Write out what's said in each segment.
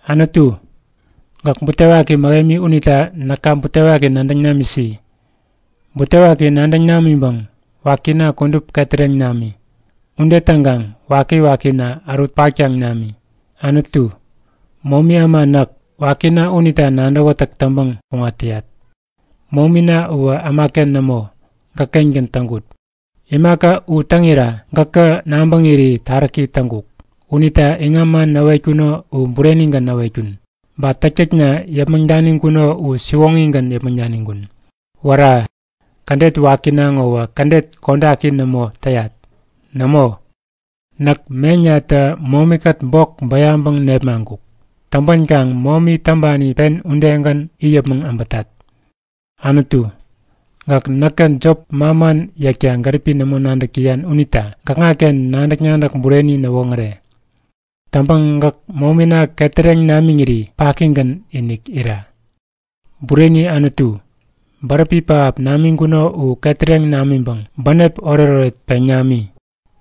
Anutu, gäk butewaki mähemi unita näka butewaki nadäŋ namisi. Butewaki nadäŋ namiŋpäŋ wakina kudup ketäreŋ nami. Ude täŋkaŋ wakiwakina ärut paktaŋ nami. Anutu, momi äma näk, wakina unita nadäwätäk täŋpäŋ kuŋat täyat. Momina uwä ämaken nämo, gäkkengän täŋkut. Imaka u täŋira gäkä nabäŋiri taräki täŋkuk. Unita iŋam man näwetkuno u burenigän näwetkun. Ba täktäkna yäpmäŋ daniŋkuno u siwoŋigän yäpmäŋ daniŋkun. Wära! Kädet wakina ŋowä kädet kodaki nämo täyat. Nämo! Näk meŋnatä momikät bok bäyaŋpäŋ nepmaŋkuk. Täŋpänkaŋ momi täŋpani pen udegän it yäpmäŋ äbätat. Anutu, gäk näkä jop manman yäkta gäripi nämo nadäk täyan unita gäkŋaken nadäk-nadäk bureni näwoŋäre. Täŋpäŋ gäk momina ketäreŋ namiŋiri pakigän-inik ira. Bureni Anutu, bäräpi pähap namiŋkuno u ketäreŋ namiŋpäŋ bänep oretoret peŋ nami.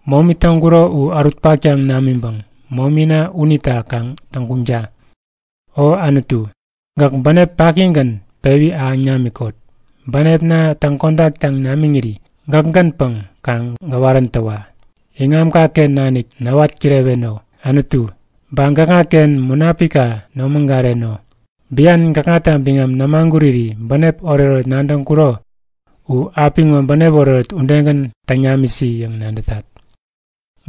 Momi täŋkuro u ärut paktaŋ namiŋpäŋ momina unita kaŋ täŋguŋta! O Anutu, gäk bänep pakigän pewi ahäŋ namikot. Bänepna täŋ kodaktaŋ namiŋiri gäkgänpäŋ kaŋ gäwaräntäwa! Iŋamkaken nanik näwat kireweno, Anutu. Ba gäkŋaken Munapikka nomägareno! Bian gäkŋata biŋam nämaguriri bänep oretoret nadäŋkuro u, apiŋo bänep oretoret udegän täŋ namisi yäŋ nadätat!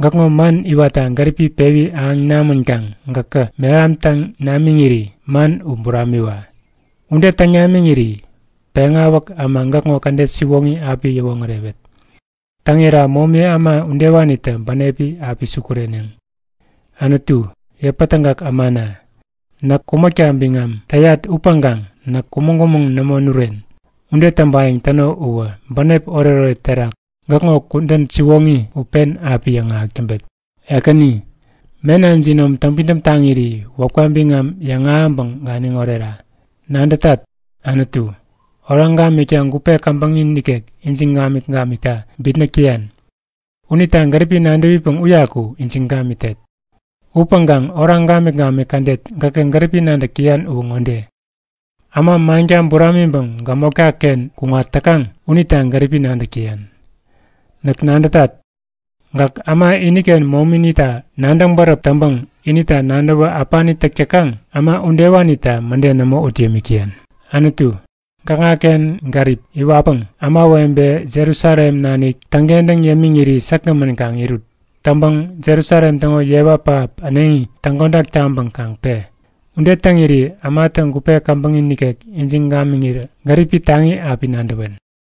Gäkŋo man iwatta gäripi pewi ahäŋ namänkaŋ gäkä mehamtäŋ namiŋiri man u buramiwa. Ude täŋ namiŋiri peŋawäk äma gäkŋo kädet siwoŋi api yäwoŋärewet. Täŋira momi äma udewanitä bänepi api sukureneŋ. Anutu, yäpätägak ämana, näk kumäkta biŋam täyat upäŋkaŋ näk kumäŋ-kumäŋ nämo nuren. Ude täŋpayäŋ täno uwä bänep oretoret terak gäkŋo kudän siwoŋi u pen api yäŋahäk täŋpet. Ekäni, mena jinom täŋpidäm taŋiri wäpka biŋam yäŋahäŋpäŋ ganiŋ orera! Nadätat! Anutu, oraŋ gamikta gupe käbäŋi nikek ijiŋ gamik-gamikta bitnäk täyan. Unita gäripi nadäwipäŋ uyaku ijiŋ gamitet. Upäŋkaŋ oraŋ gamik-gamik kädet gäkä gäripi nadäk täyan uwä ŋode; Äma manka buramiŋpäŋ gämotkaken kuŋat täkaŋ unita gäripi nadäk täyan. Näk nadätat, gäk äma iniken momita nadäŋ bäräp täŋpäŋ inita nadäwä äpani täk täkaŋ äma udewanita mäde nämo ut yämik täyan. Anutu, gäkŋaken gärip iwatpäŋ ämawebe Jerusalem nanik täŋkentäŋ yämiŋiri säkgämän kaŋ irut. Täŋpäŋ Jerusalem täŋo yewa pähap äneŋi täŋkodak taŋpäŋ kaŋ pe! Ude täŋiri ämatä gupe käbäŋi nikek ijiŋ gamiŋirä gäripi taŋi api nadäwen.